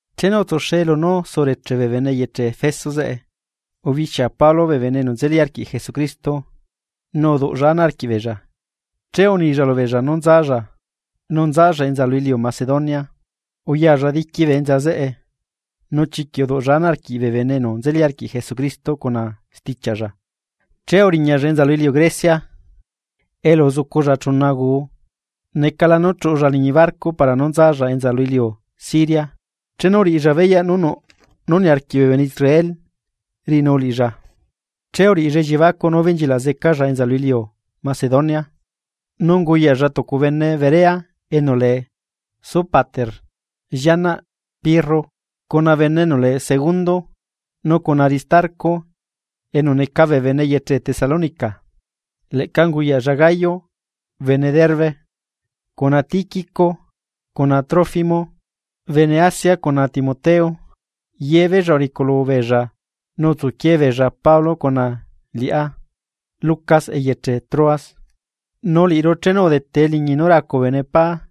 Chenu utsuxe lunú sureche bee bene eyeche Efeso zeꞌe, ubixia Pablo bee bene enu nzeli arquiꞌ Jesucristo nu uduꞌlla ana arquiꞌbeella. Che unilla lubeella nú nzalla, nu nzalla enza lu iliu Macedonia. Uyalla diqui bee enza zeꞌe nu chiquiꞌ uduꞌlla ana arquiꞌ bee bene enu nzeli arquiꞌ Jesucristo cuna stichiaꞌlla, che uriñalla enza lu iliu Grecia, elu uzuculla chuna guu. Necala nú chuꞌulla liñi barco para nú nzalla enza lu iliu Siria, chenu uriꞌilla beyaꞌ nú nuꞌ nú niarquiꞌ bee bene Israel riꞌinu liꞌilla, che uriꞌilla elliebacuꞌ nú ubenchilaꞌ zecalla enza lu iliu Macedonia. Nu unguyaꞌlla tucu bene Berea enu lee Sópater llianaꞌ Pirro, cuna bene enu lee Segundo, nu cuna Aristarco enu neca bee bene eyeche Tesalónica, leꞌca unguyaꞌlla Gayo bene Derbe, cuna Tiquico cuna Trófimo bene Asia cuna Timoteo. Yebeella uriculu beella nu utsuquie beella Pablo cuna liꞌá Lucas eyeche Troas. Nu liꞌiru, chenu udete eliñi nú racu bee bene pá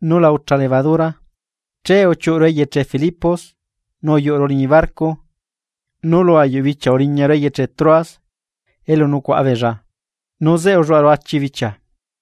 nú la ucha levadura, che uchiuꞌuru eyeche Filipos nu uyuꞌuru liñi barco nu lu ayuꞌ bichia uriñaru eyeche Troas elu nucuaꞌa beella, nu zeꞌe ulluaꞌaru achi bichia.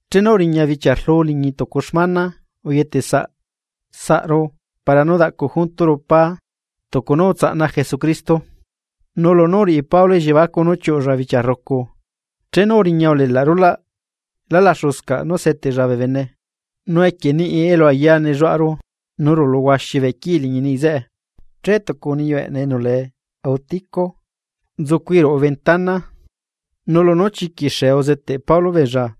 Chenu uriña bichia rlu liñi tucu xmana uyetesaꞌru para nú daꞌcu junturu pá tucu nú utsaꞌna Jesucristo, nu lunú uriꞌi Pablo elliebacuꞌ nú chiuꞌulla bichia rrucu, chenu uriña ulelaꞌ rulaꞌ lá laxuscaꞌ nú seteꞌlla bee bene. Nu equie niꞌi elu ayaa nelluaꞌaru, nu rulu huaxi bee quii liñi niꞌi zeꞌe; che tucu niyu eꞌneꞌ enu lee Eutico nzucui ruꞌu ventana. Nu lunú chiquiꞌ xee uzeteꞌ Pablo beella,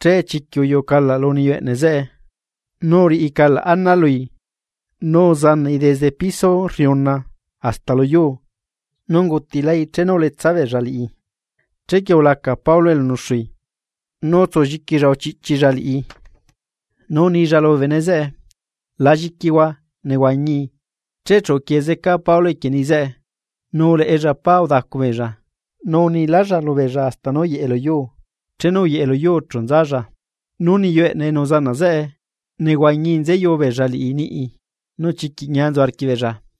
che chiquiꞌ uyuꞌu calaꞌ lu niyu eꞌneꞌ zeꞌe, nu uriꞌi calaꞌ ana lui nu uzanaꞌi desde piso rriuna hasta luyuu nu ungutilai chenu uletsa beella liꞌi. Chequie ulaca Pablo elu nuxui, nu utsulliquilla uchiꞌchilla liꞌi, nu unilla lubee bene zeꞌe: ―La lliquihua, nehuañii. Che chu uquie zeca Pablo equie niꞌi zeꞌe, nu uleꞌella pá udacu beella, nu unilálla lubeella hasta nú uyeꞌe lu yuu, chenu uyeꞌe luyuu chu nzalla. Nu niyu eꞌneꞌ enu uzanaꞌ zeꞌe, nehuañii nzeyu beella liꞌi niꞌi, nu chiquiꞌ ñia nzu arquiꞌbeella.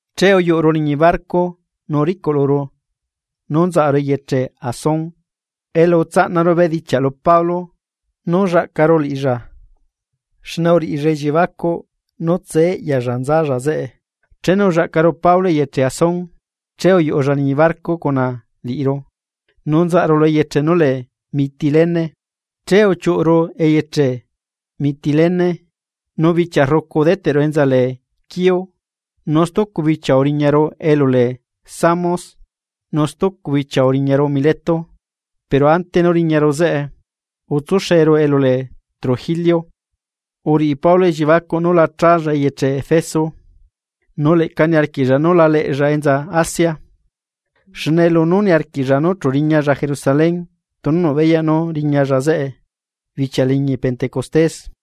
Che uyuꞌuru liñi barco nu uricuꞌluru nú nzaꞌaru eyeche Asón elu utsaꞌnaru bedichiaꞌ lu Pablo nú llaꞌcaru liꞌilla, xne uriꞌilla elliebacuꞌ nú tsee eꞌyalla nzalla zeꞌe. Chenu ullaꞌcaru Pablo eyeche Asón, che uyuꞌulla liñi barco cuna liꞌiru, nu nzaꞌaru lu eyeche nú lee Mitilene. Che uchiuꞌuru eyeche Mitilene, nu bichia rrucu udeteꞌru enza lee Quío, nu stucu bichia uriñaru elu lee Samos. Nu stucu bichia uriñaru Mileto, pero ante nú riñaru zeꞌe, utsuxeru elu lee Trogilio. Uriꞌi Pablo elliebacuꞌ nú la challa eyeche Efeso, nu leꞌca niarquiꞌlla nú la leꞌlla enza Asia, xne lunú niarquiꞌlla nú chu riñalla Jerusalén tunu nuꞌ beyaꞌ nú riñalla zeꞌe bichia liñi pentecostés.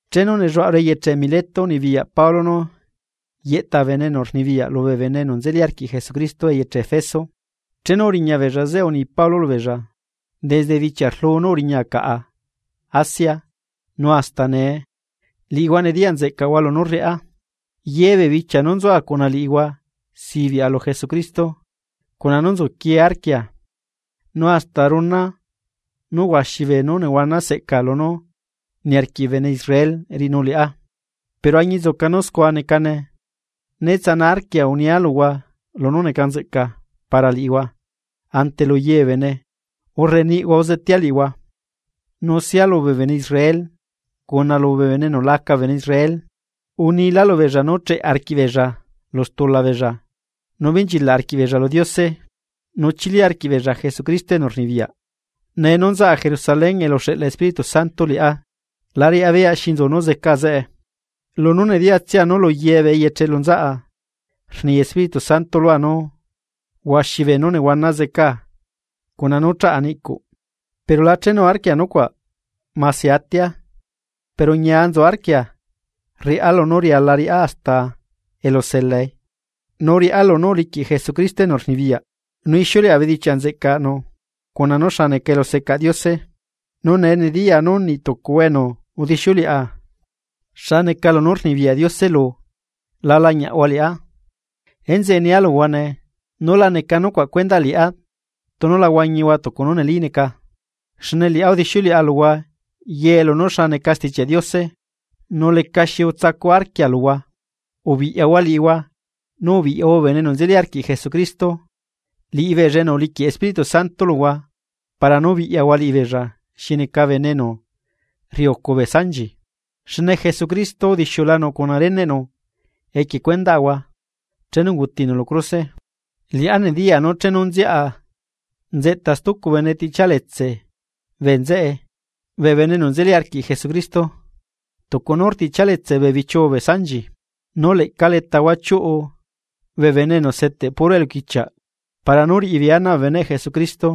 Chenu nelluaꞌaru eyeche Mileto, unibiyaꞌ Pablo nú yeꞌta bee bene enu rnibiyaꞌ lubee bene enu nzeli arquiꞌ Jesucristo eyeche Efeso, chenu uriña beella zeꞌe uni Pablo lubeella: ―Desde bichia rluu nú uriñaa caꞌa Asia nu hasta nee liꞌihua nediyaꞌ nzeꞌcaꞌhua lunú rriꞌá. Ye bee bichia nú nzua cuna liꞌihua sibiꞌa lu Jesucristo cuna nú nzuquie arquia, nu hasta runa nú huaxi beenú nehuana seꞌca lunú niarquiꞌ bee bene Israel riꞌinu liꞌá. Pero añinzuca nú scua necane, ne tsana arquia unia luhua lunú neca nzeꞌca para liꞌihua ante lu ye bee bene urre niꞌhua uzetea liꞌihua. Nu sia lubee bene Israel cuna lubee bene enu la neca bee bene Israel, unila lubeella nú cheꞌe arquiꞌbeella lu stula beella nu benchilaꞌ arquiꞌbeella lu Diose, nu chili arquiꞌbeella Jesucristo enu rnibiyaꞌ. Nee nú nzaꞌa Jerusalén elu uxeꞌla Espíritu Santo liꞌá, la riꞌá beyaꞌ xi nzu nú zeca zeꞌe. Lunú nediyatsia nú lu ye bee eyeche elu nzaꞌa rni Espíritu Santo lua nú huaxi beenú nehuana zeca cuna nú chaꞌa niꞌcuꞌ. Pero la chenuarquia nucuaꞌ mase atia, pero ñia nzu arquia rriꞌá lunú riala riꞌá hasta elu zelae, nu riꞌá lunú uliquiꞌ Jesucristo enu rnibiyaꞌ, nu ixiuleꞌa bedichiaꞌ nzeꞌcanu cuna nú xa neca elusecaꞌ Diose. ’Nu nee nediyaa nú niꞌ tucuhua enu udixiuleꞌa xa neca lunú rnibiyaꞌ Diose lu, la lañiaꞌhua liꞌá. Enzeꞌe nia luhua nee, nú la necaꞌ nucuaꞌ cuendaꞌ liꞌá tunu la huañihua tucu nú neli neca, xne liꞌá udixiuleꞌa luhua ye lunú xa neca Stichiaꞌ Diose, nu lecaxi utsacu arquia luhua. Ubiꞌyahua liꞌihua, nu ubiꞌyahua bee bene enu nzeli arquiꞌ Jesucristo, liꞌibeella enu uliquiꞌ Espíritu Santo luhua para nú biꞌyahua liꞌibeella xi neca bene enu rriucu bee sanchi, xne Jesucristo udixiulanu cuna reneꞌnu equie cuendaꞌahua chenu ungutinu lu cruse. Liꞌá nediyaa nú chenu nziaꞌa, nzeꞌta stucu bene tiꞌchialetse bee nzeꞌe bee bene enu nzeli arquiꞌ Jesucristo, tucu nú rtiꞌchialetse bee bichiuu bee sanchi. Nu leꞌca letahua chiuꞌu bee bene enu zeteꞌ puro bee eluquichiaꞌ para nú riꞌibeei ana bee beneꞌ Jesucristo,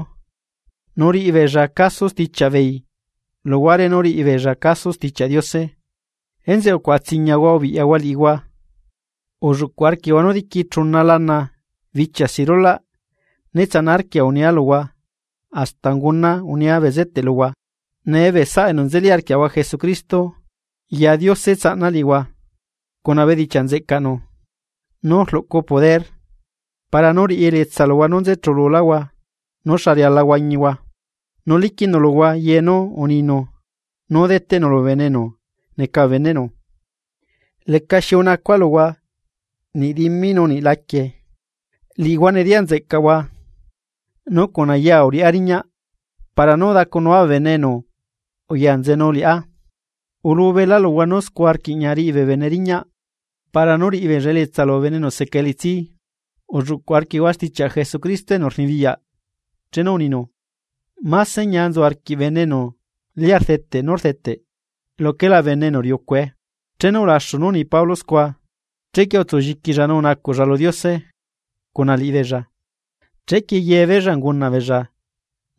nu riꞌibeella caso stichiaꞌ beei luhuare nú riꞌibeella caso Stichiaꞌ Diose. Enzeꞌe ucuaꞌatsiñahua ubiꞌyahua liꞌihua. Ulluꞌcuꞌ arquiꞌhua nú diqui chuna lana, bichia si rulaꞌ né tsana arquia unia luhua hasta unguna unia bezeteꞌ luhua. ’Nee bee saꞌa enu nzeli arquiaꞌahua Jesucristo, ya Diose tsaꞌna liꞌihua cuna bedichiaꞌ nzeꞌcaꞌnu, nú rluꞌcu poder para nú riꞌi elietsa luhua nú nze chululáhua nú xa riala nú huañihua, nu liquiꞌnu luhua ye nú uninu nú deteꞌnu lubee bene enu neca bee beneꞌnu. Lecaxi unacua luhua niꞌ dimi nu niꞌ laquie. Liꞌihua nediyaꞌ nzeꞌcaꞌhua nú cuna yaa uriꞌá riñaꞌ para nú udacunua bee bene enu uya nzenu liꞌá. Ulubelá luhua nú scua rquiꞌña riꞌi bee bene riñaꞌ para nú riꞌibeella elietsa lubee bene enu seca elitsi, ulluꞌcuꞌ arquiꞌhua stichiaꞌ Jesucristo enu rnibiyaꞌ chenu uninu: “Máse ñia nzu arquiꞌ bene enu lia rdeteꞌ nú rdeteꞌ luquela bene enu riucue.” Chenu ulaxu nú uni Pablo scua, chequie utsulliquilla nu unacuꞌlla lu Diose cuna liꞌibeella. Che yebeella ungunaꞌbeella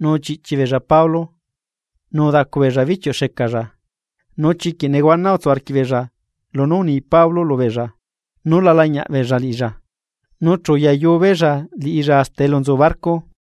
nu uchiꞌchi beella Pablo nu udacu beella bichiuꞌ xecalla. Nu chiquiꞌ nehuana utsu arquiꞌbeella lunú uni Pablo lubeella nú la lañiaꞌ beella liꞌilla. Nu chu uyayu beella liꞌilla hasta elu nzu barco.